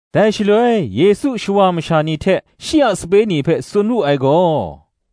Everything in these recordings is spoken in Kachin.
Dai shaloi Yesu shawa masha ni hte shi a sape ni hpe tsun wu ai gaw,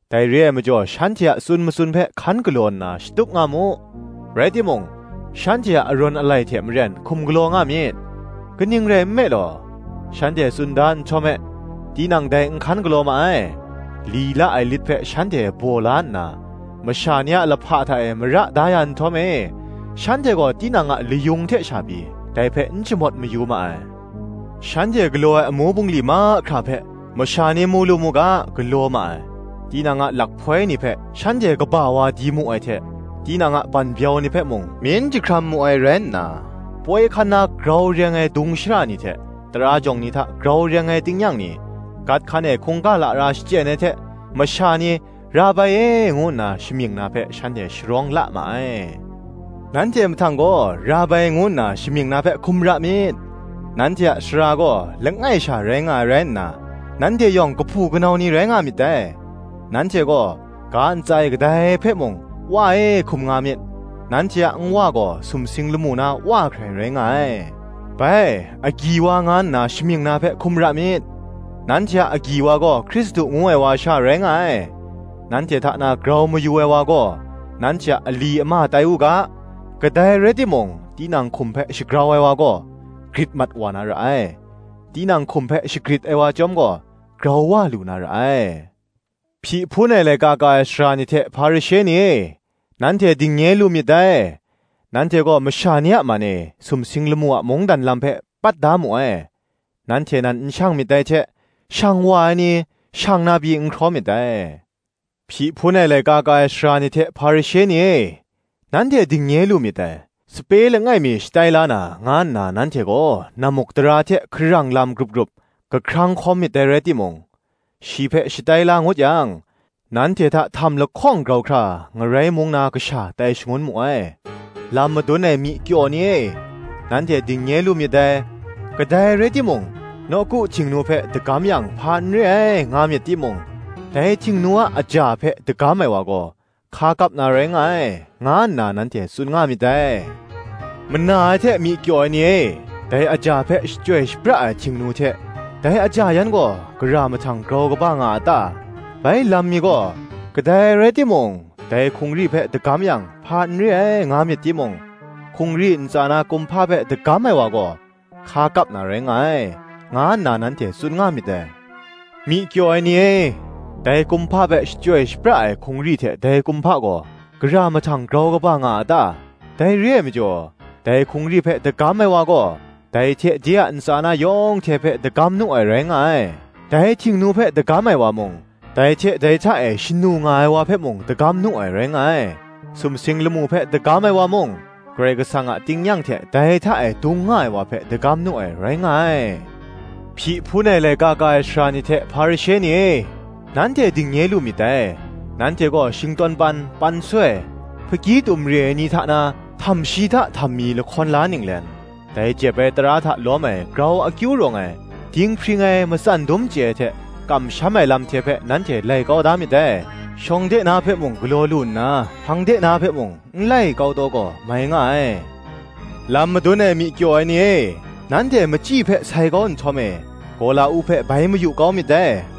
Dai re ai majaw shanhte a tsun matsun hpe hkan galaw nna shatup nga mu; rai timung, shanhte a arawn alai hte maren hkum galaw nga myit: kaning rai nme law, shanhte tsun da nhtawm e, tinang dai n hkan galaw ma ai. Li la ai lit hpe shanhte baw la nna, masha ni a lahpa hta e mara da ya nhtawm e shanhte gaw tinang a layung hte sha pyi, dai hpe n shamawt mayu ma ai. Shanhte galaw ai amu bungli mahkra hpe, masha ni mu lu mu ga, galaw ma ai: tinang a lakhpoi ni hpe shanhte kaba wa di mu ai hte, tinang a banbyau ni hpe mung myin jahkram mu ai rai nna, poi hkan na grau reng ai dung shara ni hte, tara jawng ni hta grau reng ai tingnyang ni, gat hkan e hkungga lara shachyen ai hte, masha ni, ‘Rabai e,’ ngu nna shamying na hpe, shanhte sharawng la ma ai. Nanhte mahtang gaw, ‘Rabai,’ ngu nna shamying na hpe hkum ra myit: nanhte a Sara gaw langai sha rai nga ai rai nna, nanhte yawng kahpu kanau ni rai nga myit dai. Nanhte gaw, ga ntsa e kadai hpe mung, ‘Wa e,’ hkum nga myit: nanhte a Nwa gaw sumsing lamu na Wa hkrai rai nga ai. Bai, Agyi wa nga nna shamying na hpe hkum ra myit: nanhte a Agyi wa gaw Hkristu ngu ai wa sha rai nga ai. Nanhte hta na grau mayu ai wa gaw, nanhte a ali ama tai u ga. Kadai rai timung tinang hkum hpe shagrau ai wa gaw, grit mat wa na ra ai: tinang hkum hpe shagrit ai wa chyawm gaw, grau wa lu na ra ai. Hpyi hpun ai laika ka ai sara ni hte Hparishe ni e, nanhte dingnye lu myit dai: nanhte gaw masha ni a man e, sumsing lamu a mungdan lam hpe pat da mu ai: nanhte nan n shang myit dai hte, shang wa ai ni, shang na pyi, n hkraw myit dai. Hpyi hpun ai laika ka ai sara ni hte Hparishe ni e, nanhte dingnye lu myit dai: sape langai mi shatai la na, nga nna nanhte gaw nammukdara hte hkarang lam grup grup kahkrang hkawm myit dai rai timung, shi hpe shatai la ngut yang, nanhte hta htam lahkawng grau hkra, ngarai mung na kasha tai shangun mu ai. Lam madun ai myi kyaw ni e, nanhte dingnye lu myit dai: Kadai rai timung, nawku Htingnu hpe dagam yang hpa n re ai, nga myit timung, dai Htingnu a aja hpe dagam ai wa gaw hka kap na rai nga ai, nga nna nanhte tsun nga myit dai. Mana ai hte myi kyaw ai ni e, dai aja hpe shachyoi shapra ai Htingnu hte dai aja yan gaw, gara mahtang grau kaba nga a ta? Bai lam mi gaw, Kadai rai timung, dai hkungri hpe dagam yang, hpa n re ai, nga myit timung, hkungri ntsa na kumhpa hpe dagam ai wa gaw, hka kap na rai nga ai, nga nna nanhte tsun nga myit dai. Myi kyaw ai ni e, dai kumhpa hpe shachyoi shapra ai hkungri hte dai kumhpa gaw, gara mahtang grau kaba nga a ta? Dai re ai majaw, dai hkungri hpe dagam ai wa gaw, dai hte de a ntsa na yawng hte hpe dagam nu ai rai nga ai. Dai Htingnu hpe dagam ai wa mung, dai hte dai hta e shanu nga ai wa hpe mung dagam nu ai, rai nga ai. Sumsing lamu hpe dagam ai wa mung, Karai Kasang a tingnyang hte dai hta e dung nga ai wa hpe dagam nu ai, rai nga ai. Hpyi hpun ai laika ka ai sara ni hte Hparishe ni e, nanhte dingnye lu myit dai: nanhte gaw shingtawn pan, pansoi, hpakgyi tum re ai ni hta na, htamshi hta htammi lahkawn la ninglen, dai jep ai tara hta lawm ai grau akyu rawng ai, dinghpring ai, matsan dum chye ai hte kamsham ai lam hte hpe nanhte lai kau da myit dai: shawng de na hpe mung galaw lu nna, hpang de na hpe mung n lai kau taw gaw, mai nga ai. Lam madun ai myi kyaw ai ni e, nanhte machyi hpe sai kau nhtawm e, gawla-uk hpe bai mayu kau myit dai.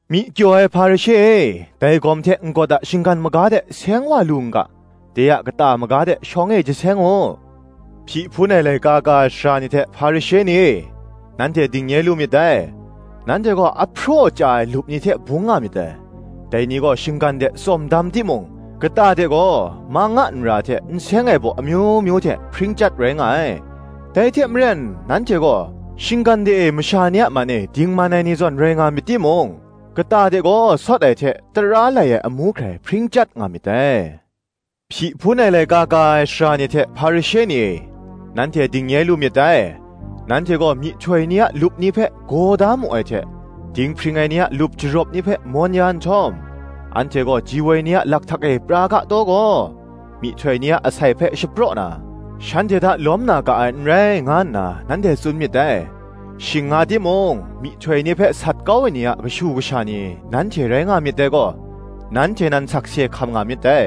Myi kyaw ai Hparishe e, dai gawm hte n-gawt a shinggan maga de seng wa lu n ga, de a kata maga de shawng e jaseng u. Hpyi hpun ai laika ka ai sara ni hte Hparishe ni e, nanhte dingnye lu myit dai: nanhte gaw ahpraw chya ai lup ni hte bung nga myit dai: dai ni gaw shinggan de tsawm dam timung, kata de gaw, mang a nra hte nseng ai baw amyu myu hte hpring chyat rai nga ai. Dai hte maren nanhte gaw, shinggan de e masha ni a man e dingman ai ni zawn rai nga myit timung, kata de gaw sawt ai hte tara lai ai amu hkrai hpring chyat nga myit dai. Hpyi hpun ai laika ka ai sara ni hte, Hparishe ni e, nanhte dingnye lu myit dai; nanhte gaw myihtoi ni a lup ni hpe gaw da mu ai hte dinghpring ai ni a lup jarawp ni hpe mawn ya nhtawm, “Anhte gaw ji woi ni a lakhtak e pra ga taw gaw, myihtoi ni a asai hpe shapraw na, shanhte hta lawm na ga ai n rai,” nga nna nanhte tsun myit dai. Shing nga timung myihtoi ni hpe sat kau ai ni a kashu kasha ni nanhte rai nga myit dai gaw, nanhte nan sakse hkam nga myit dai.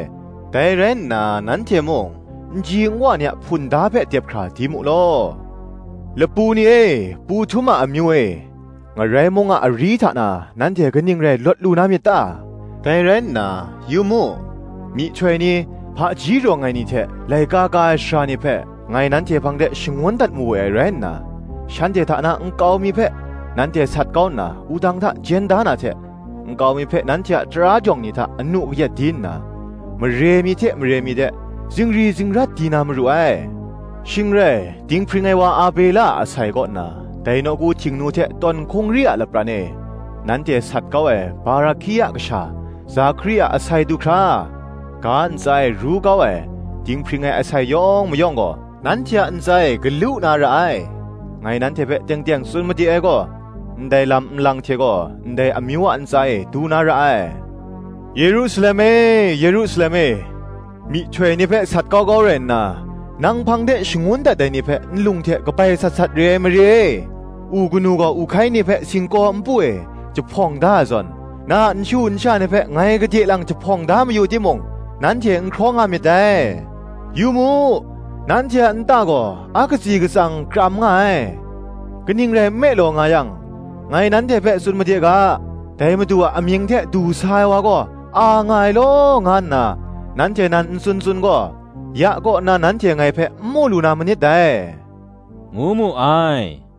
Dai rai nna nanhte mung nji nwa ni a hpunda hpe dep hkra di mu law. Lapu ni e pu htum a amyu e, Ngarai mung a ari hta na, nanhte kaning rai lawt lu na myit ta? Dai rai nna, yu mu, myihtoi ni, hpaji rawng ai ni hte, laika ka ai sara ni hpe, ngai nanhte hpang de shangun dat mawe ai rai nna, shanhte hta na nkau mi hpe nanhte sat kau nna wudang hta jen da na hte, nkau mi hpe nanhte a tara jawng ni hta anu kayat di nna, mare mi hte mare mi de zingri zingrat di na maru ai: Shing rai, dinghpring ai wa Abela a asai kaw nna, dai nawku Htingnu hte tawn hkungri a lapran e nanhte sat kau ai Barahkia kasha Zakari a asai du hkra, ga ntsa e ru kau ai, dinghpring ai asai yawng mayawng gaw, nanhte a ntsa e galu na ra ai. Ngai nanhte hpe teng teng tsun made ai gaw, ndai lam nlang hte gaw, ndai amyu a ntsa e du na ra ai. “Yerusalem e, Yerusalem e, myihtoi ni hpe sat kau kau rai nna, nang hpang de shangun dat ai ni hpe nlung hte kabai sat sat re ai mare e!- u kanu gaw, u hkai ni hpe singkaw npu e jahpawng da ai zawn, na a nshu nsha ni hpe ngai gade lang jahpawng da mayu timung nanhte n hkraw nga myit dai. Yu mu, nanhte a nta gaw a katsi katsang kram nga ai. Kaning rai nme law nga yang, ngai nanhte hpe tsun made ga, Dai Madu a amying hte du sa ai wa gaw a nga ai law, nga nna nanhte nan n tsun tsun gaw, ya kaw nna nanhte ngai hpe n mu lu na manit dai,” ngu mu ai.